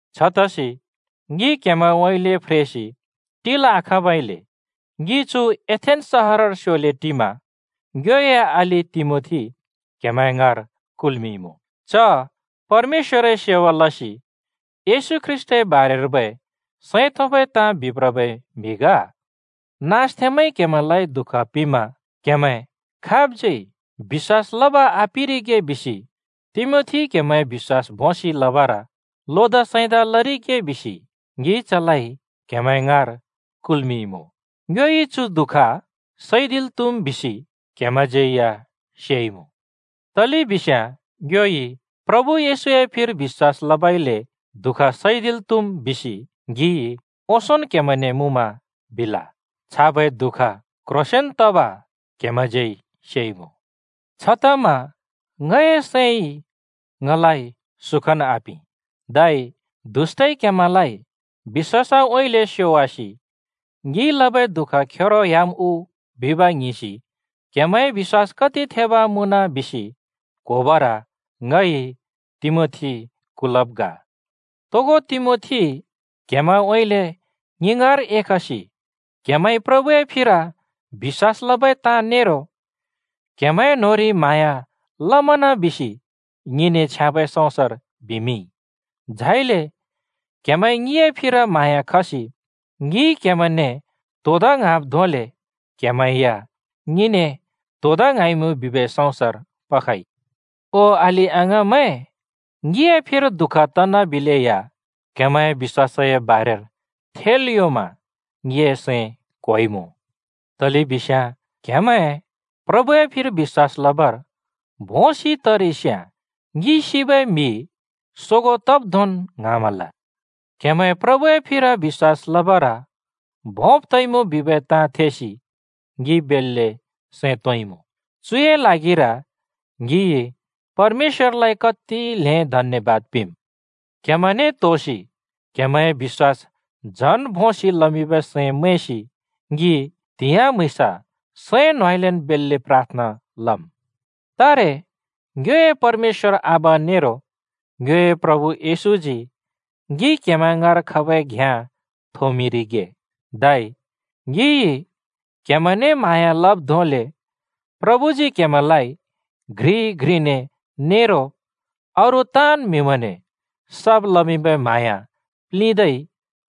छतसि ङि क्हेमैंउँइँले फ्रेसि टिल् आखाँबइले ङि चु एथेन्‍स सहरर स्योले टिमा ङ्योए अलि तिमोथी क्‍हेमैं ङाँर कुलइमुँ। च परमेश्‍वरए सेवा लसि येशू ख्रीष्‍टए बारेर्बै सैं तोंबै ताँ बिप्रबै म्हि ग। नाँसथेंमैंइ क्हेमैंलाइ दुःख पिंमा क्हेमैं खाबज्यै बिश्‍वास लब आपिरिगे बिसि तिमोथीइ क्हेमैंए बिश्‍वास भोंसि लबर लोदा सैंदा लरिगे बिसि ङिइ चलाइ क्‍हेमैं ङाँर कुल्‍मिंइमुँ। ङ्योइ चु दुःख सैदिल् त्‍हुम् बिसि क्हेमैंज्यै या सेइमुँ। तलेबिस्याँ “ङ्योइ प्रभु येशूए फिर बिश्‍वास लबइले दुःख सैदिल् त्‍हुम्” बिसि ङिइ ओंसोंन् क्‍हेमैंने मुँमा बिल। छाबै दुःख क्‍ह्रोंसेंन तब क्‍हेमैंज्यै सेइमुँ। छतमा ङए सैंइ ङलाइ सुखन् आपिं। धै “दुष्‍टइ क्‍हेमैंलाइ बिश्‍वासउँइँले स्योवासि ङिइ लबै दुःख खेरो ह्‍याम् उ?” बिब् ङ्हिंसि क्हेमैंए बिश्‍वास कति थेब् मुँन बिसि क्होबर ङइ तिमोथी कुल्‍मिंब् ग। तोगो तिमोथी क्‍हेमैंउँइँले ङि ङाँर एखसि क्‍हेमैंइ प्रभुए फिर बिश्‍वास लबै ताँ नेरो क्‍हेमैंए न्‍होंरि म्हाँया लमन बिसि ङिने छ्याँबै सँउँसर बिमिंइ। झाइले क्‍हेमैंइ ङिए फिर म्हाँया खसि ङिइ क्‍हेमैंने त्होदा ङ्हाँब् धोंले क्‍हेमैं या ङिने त्होदा ङ्हाँइमुँ बिबै सँउँसर पखइ। ओ अलि-अङाँमैं, ङिए फिर दुःख तनाबिलेया क्‍हेमैंए बिश्‍वासए बारेर थेल् योंमा ङिए सैं क्होइमुँ। तलेबिस्याँ क्‍हेमैं प्रभुए फिर बिश्‍वास लबर भोंसि तरिस्याँ ङि सिबै म्हि सोगों तब् धोंन् ङ्हाँमल। क्हेमैं प्रभुए फिर बिश्‍वास लबर भोंब् तइमुँ बिबै ताँ थेसि ङि बेल्‍ले सैं तोंइँमुँ। चुए ल्हागिर ङिइ परमेश्‍वरलाइ कति ल्हें धन्‍यबाद पिंम्। क्हेमैंने त्होसि क्हेमैंए बिश्‍वास झन भोंसि लमिंबै सैं मैंसि ङि त्‍हिंयाँ म्‍हुँइँस सैं न्होंउँइँलेन् बेल्‍ले प्राथना लम्। तारे ङ्योए परमेश्‍वर आबा नेरो ङ्योए प्रभु येशूजी ङि क्‍हेमैं ङाँर खबै घ्याँ थोंमिंरिगे, धै ङिइ क्‍हेमैंने म्हाँया लब् धोंले प्रभुजी क्‍हेमैंलाइ घ्रिइ घ्रिने नेरो अरू ताँन् म्‍हिमैंने सब् लमिंबै म्हाँया प्लिंदै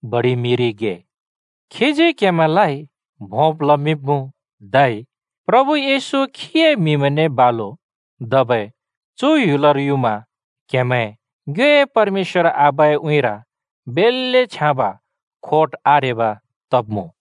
बडिमिंरिगे। खीजी क्हेमैंलाइ भोंब् लमिंब्मुँ, धै प्रभु येशू खीए म्हिमैंने बालु धबै चु ह्‍युलर युमा क्हेमैं ङ्योए परमेश्‍वर आबाए उँइँर बेल्‍ले छ्याँब खोट आरेब तब्मुँ।